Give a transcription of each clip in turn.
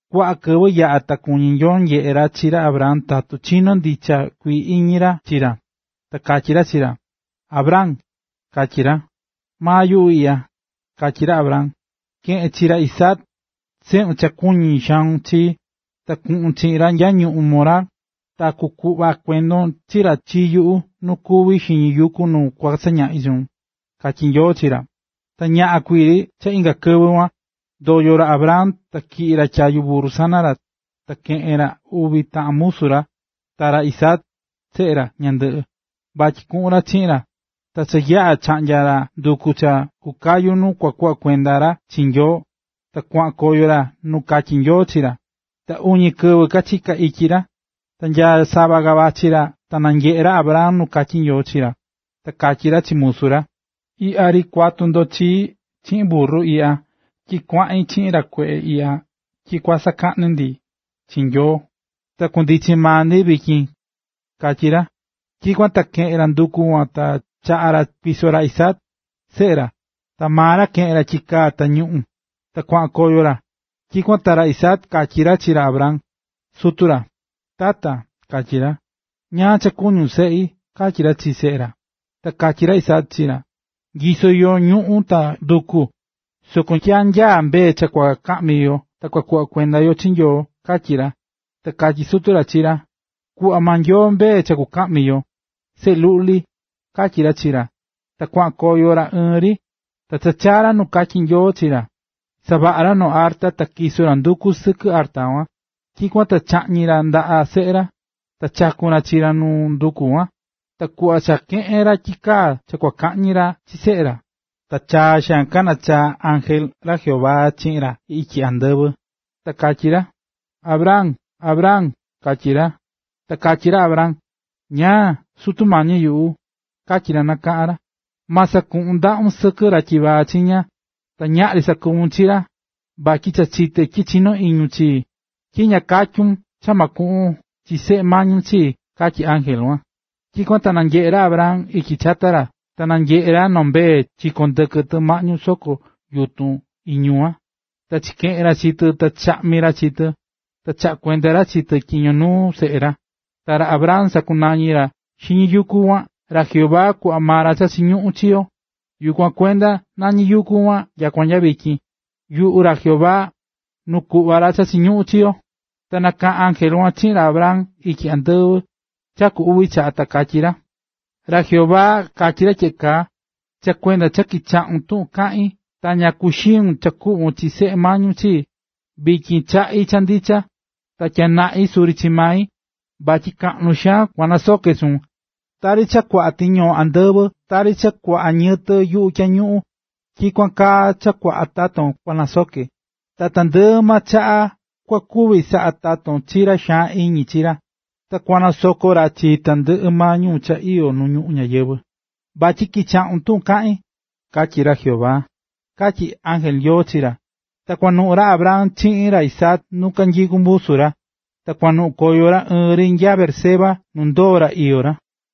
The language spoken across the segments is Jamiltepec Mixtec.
Kuaꞌa kɨvɨ yaꞌa̱ ta kuñí Nyoo nyeꞌe ra chi ra Abraham tatu chinó ndicha kuii iñi ra chi ra. Ta katyí ra chi ra: —Abraham ―katyí ra. ―Maa yuꞌu iꞌya ―katyí ra Abraham. ―Ke̱ꞌen chi ra Isaac, seꞌun cha kuñí xaun chi, ta kuꞌun chiꞌin ra nya ñuꞌún Moriah, ta kuꞌva kuendon chi ra chi yuꞌu nuu kuví xiñi yuku nu kua sañaꞌi chuun ―katyí Nyoo chi ra. Ta ñaꞌan kuii ri cha inga kɨvɨ kuan, ndoyo̱ ra Abraham ta tyiꞌi̱ ra tyayu burru sana ra, ta keꞌe̱n ra uvi taꞌan musu, ta ra Isaac, seꞌe ra, ñandɨꞌɨ, vatyi kuꞌun ra chiꞌin ra. Ta cha yaꞌa̱ chaꞌnya̱ ra nduku cha kukayu nu kua kuꞌva kuenda ra chi Nyoo, ta kuaꞌan koyo ra nu katyí Nyoo chi ra. Ta uñi kɨvɨ kachiká ityi ra. Ta nya sava ka vachí ra ta nanyeꞌé ra Abraham nu katyí Nyoo chi ra. Ta katyí ra chi musu ra: ―Iꞌya ri kuatu ndo chii chiꞌin burru iꞌya tyi kuaꞌin chiꞌin ra kueꞌe iꞌya tyi kua sakaꞌnu ndi chi Nyoo, ta kundichi maa ndi vityin―katyí ra. Tyikuan ta keꞌe̱n ra nduku kuan ta chaꞌa̱ ra kuiso ra Isaac, seꞌe ra, ta maa ra keꞌe̱n ra tyikaa ta ñuꞌu̱n, ta kuaꞌan koyo ra. Tyikuan ta ra Isaac katyí ra chi ra Abraham, sutu ra: ―Tata ―katyí ra. ―¿Ñáá cha kuñún, seꞌi? ―katyí ra chi seꞌe ra. Ta katyí ra Isaac chi ra: ―Nyisó yo ñuꞌu̱n ta nduku, soko ¿nya nyaá mbee cha kua kaꞌmi yo ta kuꞌva kuenda yo chi Nyoo? ―katyí ra. Ta katyí sutu ra chi ra: ―Kukuꞌva maa Nyoo mbee cha kukaꞌmi yo, seꞌe luꞌli ―katyí ra chi ra. Ta kuaꞌan koyo ra ɨɨn ri. Ta cha kachaa̱ ra nu katyí Nyoo chi ra, savaꞌa̱ ra noo arta ta tyiso̱ ra nduku sɨkɨ arta kuan. Tyikuan ta chaꞌñi̱ ra ndaꞌa seꞌe ra, ta chaku̱n ra chi ra nuu nduku kuan. Ta kuꞌva cha keꞌe̱n ra tyikaa cha kua kaꞌñi ra chi seꞌe ra, ta chaa xaan nakaꞌa̱n ángel ra Jehová chiꞌin ra ityi andɨvɨ, ta katyí ra: ―¡Abraham, Abraham! ―katyí ra. Ta katyí ra Abraham: ―¿Ñáá?, Sutu mañi yuꞌu ―katyí ra nakaꞌa̱n ra. ―Ma sakaun ndaꞌun sɨkɨ ra tyivaa chiña, ta ñaꞌri sakuvun chi ra, vatyi cha chité tyi chinó iñun chii, tyi ña katyun cha ma kuꞌvon chi seꞌe mañun chii ―katyí ángel kuan. Tyikuan ta nanyeꞌe̱ ra Abraham ityi chata ra, ta nanyeꞌe̱ ra noo mbee chikón ndɨkɨ tɨ maꞌñu soko yutun iñu kuan. Ta chikeꞌe̱n ra chi tɨ ta chaꞌñi̱ ra chi tɨ, ta chaꞌa̱ kuenda ra chi tɨ tyiño nuu seꞌe ra. Ta ra Abraham sakunañí ra xiñi yuku kuan: “Ra Jehová kuꞌva ra cha chiñuꞌún chi yo”. Yukuan kuenda nañí yuku kuan nyakua nya vityin: “Yuku ra Jehová, nu kuꞌva ra cha chiñuꞌún chi yo”. Ta nakaꞌa̱n ángel kuan chiꞌin ra Abraham ityi andɨvɨ cha ku uvi chaꞌa, ta katyí ra: ―Ra Jehová katyí ra tyeꞌe kaa: “Cha kuenda cha kichaꞌu̱n tuꞌun kaꞌín ta ña kuxiu̱n cha kuꞌvon chi seꞌe mañun chii, vityin kaꞌín cha ndicha, ta tyanaꞌin suri chi mai, vatyi kaꞌnu xaan kua nasoke chuun. Tari cha kuaꞌa tiñoo andɨvɨ ta tari cha kuaꞌa ñiyɨtɨ yuꞌu tyañuꞌun, tyikuan kaa cha kuaꞌa taton kua sanakuñe. Ta tandɨꞌɨ maa chaꞌa kua kuvi chasaꞌa taton chi ra xaan iñi chi ra. Ta kua kanasoko ra chi tandɨꞌɨ maa ñuu cha iyó nu ñuꞌún ñayɨvɨ̱, vatyi kichaꞌu̱n tuꞌun kaꞌín”, katyí ra Jehová ―katyí ángel Nyoo chi ra. Ta kuanuꞌun ra Abraham chiꞌin ra Isaac nu kanyikú musu ra, ta kuanuꞌun koyo ra ɨɨn ri nya Beerseba nu ndoo̱ ra iyó ra.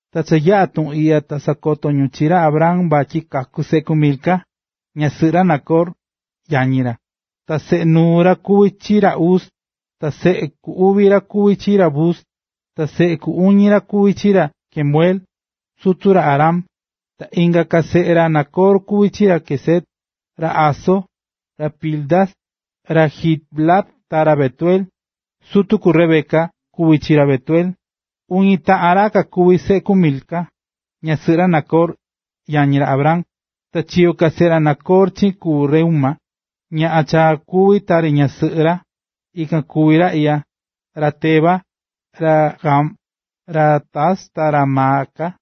Ta cha yaꞌa̱ tuꞌun iꞌya ta sakoto̱ ñu chi ra Abraham vatyi kaku̱ seꞌe ku Milca, ñasɨꞌɨ ra Nacor, yañi ra. Ta seꞌe nuu ra kuví chi ra Uz, ta seꞌe ku uvi ra kuví chi ra Buz, ta seꞌe ku uñi ra kuví chi ra Kemuel, sutu ra Aram. Ta inga ka seꞌe ra Nacor kuví chi ra Quesed, ra Hazo, ra Pildas, ra Jidlaf ta ra Betuel. Sutu ku Rebeca kuví chi ra Betuel. Uña taꞌan ra kakuví seꞌe ku Milca, ñasɨꞌɨ ra Nacor, yañi ra Abraham. Ta chiyo̱ ka seꞌe ra Nacor chiꞌin ku Reúma, ñaꞌan cha kuví tari ñasɨꞌɨ ra, ikan kuví ra iꞌya: ra Teba, ra Gaham, ra Tahas ta ra Maaca.